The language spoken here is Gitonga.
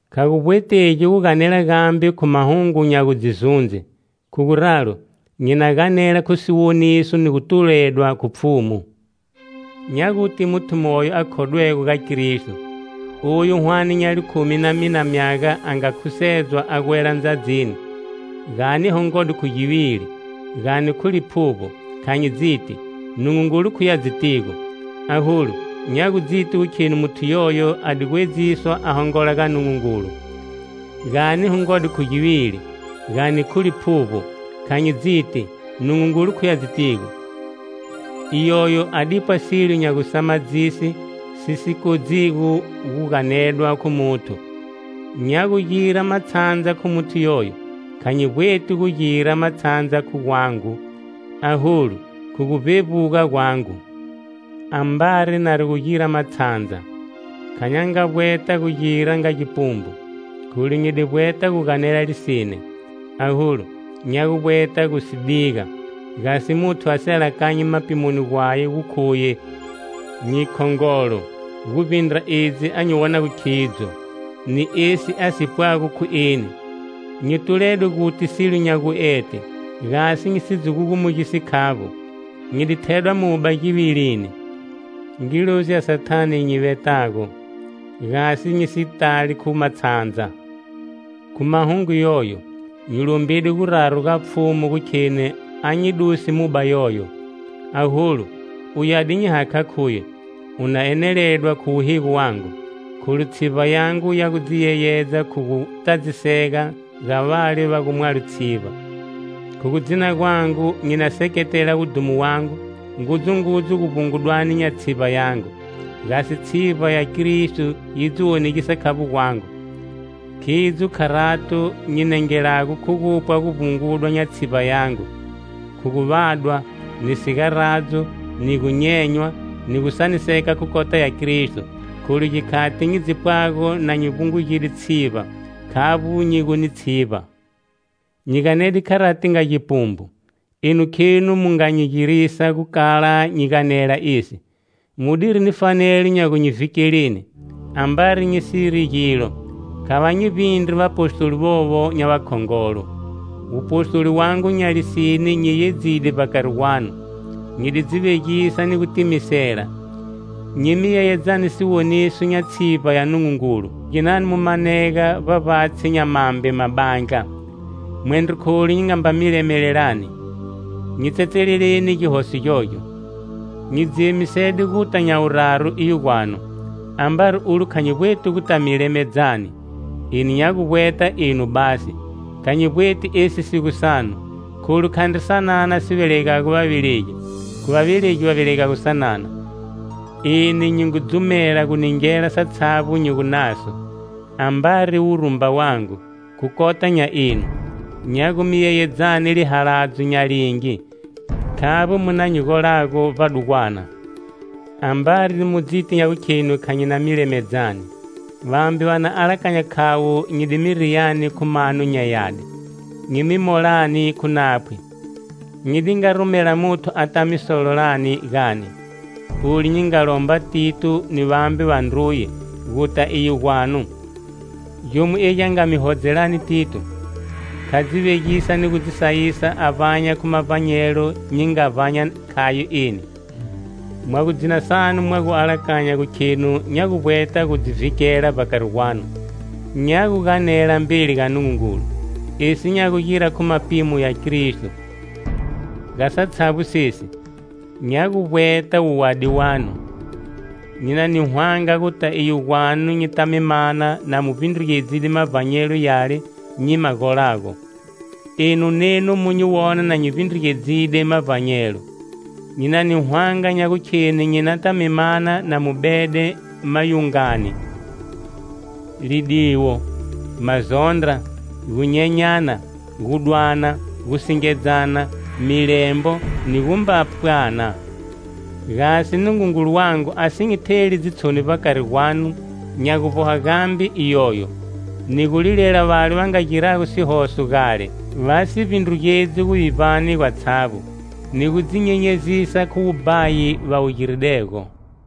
Kha gu vbwetegi guganela gambe khu mahungu nya gu dzi zundze. Khu guralo, nyi na ganela khu siwoniso ni gu tuledwa khu Pfhumu. Nya guti muthu moyo a khodwego ga Kristo, oyu hwane nya likhumi na mina myaga a nga khusedzwa a gwela Ndzadzini. Gani hongode khu givili, gani khu liphuvbo, kha nyi dziti. Nungungulu khuye a dzitigo, Aholu, nya gu dziti gu kheni muthu yoyo a di gwedziswa a hongola ga Nungungulu. Gani hongode khu givili, gani khu liphuvbo, kha nyi dziti. Nungungulu khuye a dzitigo. Iyoyo, a dipwa silo nya gusamadzise, si si kodzigo gu ganedwa khu muthu. Nya gugira matshandza khu muthu yoyo. Kha nyi vbweti gu gira matshandza khu gwangu, aholu, khu gu vbevbuga gwangu. Ambari nari gu gira matshandza, kha nya nga vbweta gu gira nga gipumbu, kholu nyi di vbweta guganela lisine. Aholu, nya gu vbweta gu si diga, gasi muthu a si alakanyi mapimoni gwaye gu khuye nyi khongolo, guvbindra edzi a nyi wonago khidzo, ni esi a si pwago khu eni. Nyi tuledwe guti silo nya guete, gasi nyi si dzi gugumugisi khavbo, nyi di thedwa muba givilini, ngilozi ya Sathane gi nyi vetago, gasi nyi si tali khu matshandza. Khu mahungu yoyo, nyi lombide guraru ga Pfhumu gu kheni a nyi duse muba yoyo. Aholu, uye a di nyi hakha khuye: "U na eneledwa khu wuhigo wangu, kholu tshivba yangu ya gu dzi yeyedza khu gu tadzisega, ga vale va gumwalo tshivba." Khu gu dzina gwangu nyi na seketela wudhumo wangu ngudzungudzu guvbungugani nya tshivba yangu, gasi tshivba ya Kristo yi dzi wonegisa khavbo gwangu. Khidzo kharato nyi nengelago khu gupwa guvbunguga nya tshivba yangu, khu gu vadwa, ni sigaradzo, ni gunyenywa, ni gusaniseka khu khota ya Kristo. Kholu gikhati nyi dzi pwago na nyi vbungugide tshivba, khavbo nyi gu ni tshivba. Nyi ganede kharati nga gipumbu. Enu khenu mu nga nyi girisa gu kala nyi ganela esi, mu diri ni fanelo nya gu nyi vhikeleni. Ambari nyi siri gilo, kha va nyi vbindri vapostoli vovo nya vakhongolo. Wupostoli wangu nya lisine nyi yeyedzide vbakari gwanu: nyi di dzi vegisa ni gu timisela, nyi mi yeyedzani siwoniso nya tshivba ya Nungungulu. Khu ginani mu manega vbavbatshi nya mambe mabandla? Mwendro kholu nyi nga mba mi lemelelani! Nyi tsetseleleni gihoso gyogyo! Nyi dzi emisede guta nya guraru iyo gwanu. Ambari ulo kha nyi vbweti guta mi lemedzani. Eni nya gu vbweta enu basi, kha nyi vbweti esi si gu sanu. Kholu khandri sanana si vegelago vavelegi, khu vavelegi va vegelago sanana. Eni nyi ngu dzumela gu ningela satshavbo nyi gu naso, ambari wurumba wangu khu kota nya enu. Nya gu mi yeyedzani lihaladzo nya lingi, khavbo mu na gu nyi golago vbadugwana? Ambari mu dziti nya gukhenu kha nya mi lemedzani, vambe va na alakanya khavo nyi di mi riyani khu mano nya yadi, nyi mi molani khu naphwi. Nyi di nga rumela muthu ata mi sololani gani? Olu nyi nga lomba Tito, ni vambe vandruye, Guta iyo gwanu. Gyomo egi a nga mi hodzelani Tito? Kha dzi vegisa ni gu dzi sayisa a vbanya khu mavbanyelo nyi nga vbanya khayo eni? Mwa gu dzina sanu mwa gu alakanya gu khenu nya gu vbweta gu dzi vhikela vbakari gwanu. Nya guganela mbeli ga Nungungulu, esi nya gugira khu mapimo ya Kristo. Ga satshavbo sesi, nya gu vbweta wuwadi wanu. Nyi na ni hwanga guta iyo gwanu, nyita mi mana na mu vbindrugedzide mavbanyelo yale nyi ma golago, enu nenu mu nyi wona na nyi vbindrugedzide mavbanyelo. Nyi na ni hwanga nya gukheni nyi nata mi mana na mu bede mayungani, lidiwo, mazondra, gunyenyana, gudwana, gusingedzana, milembo, ni gumba pwana. Gasi Nungungulu wangu a si nyi theli dzitshoni vbakari gwanu, nya gu vboha gambe iyoyo. Ni gulilela vale va nga girago sihoso gale, va si vbindrugedzi guvivbani gwatshavbo, ni gu dzi nyenyezisa khu wubhayi va wu giridego.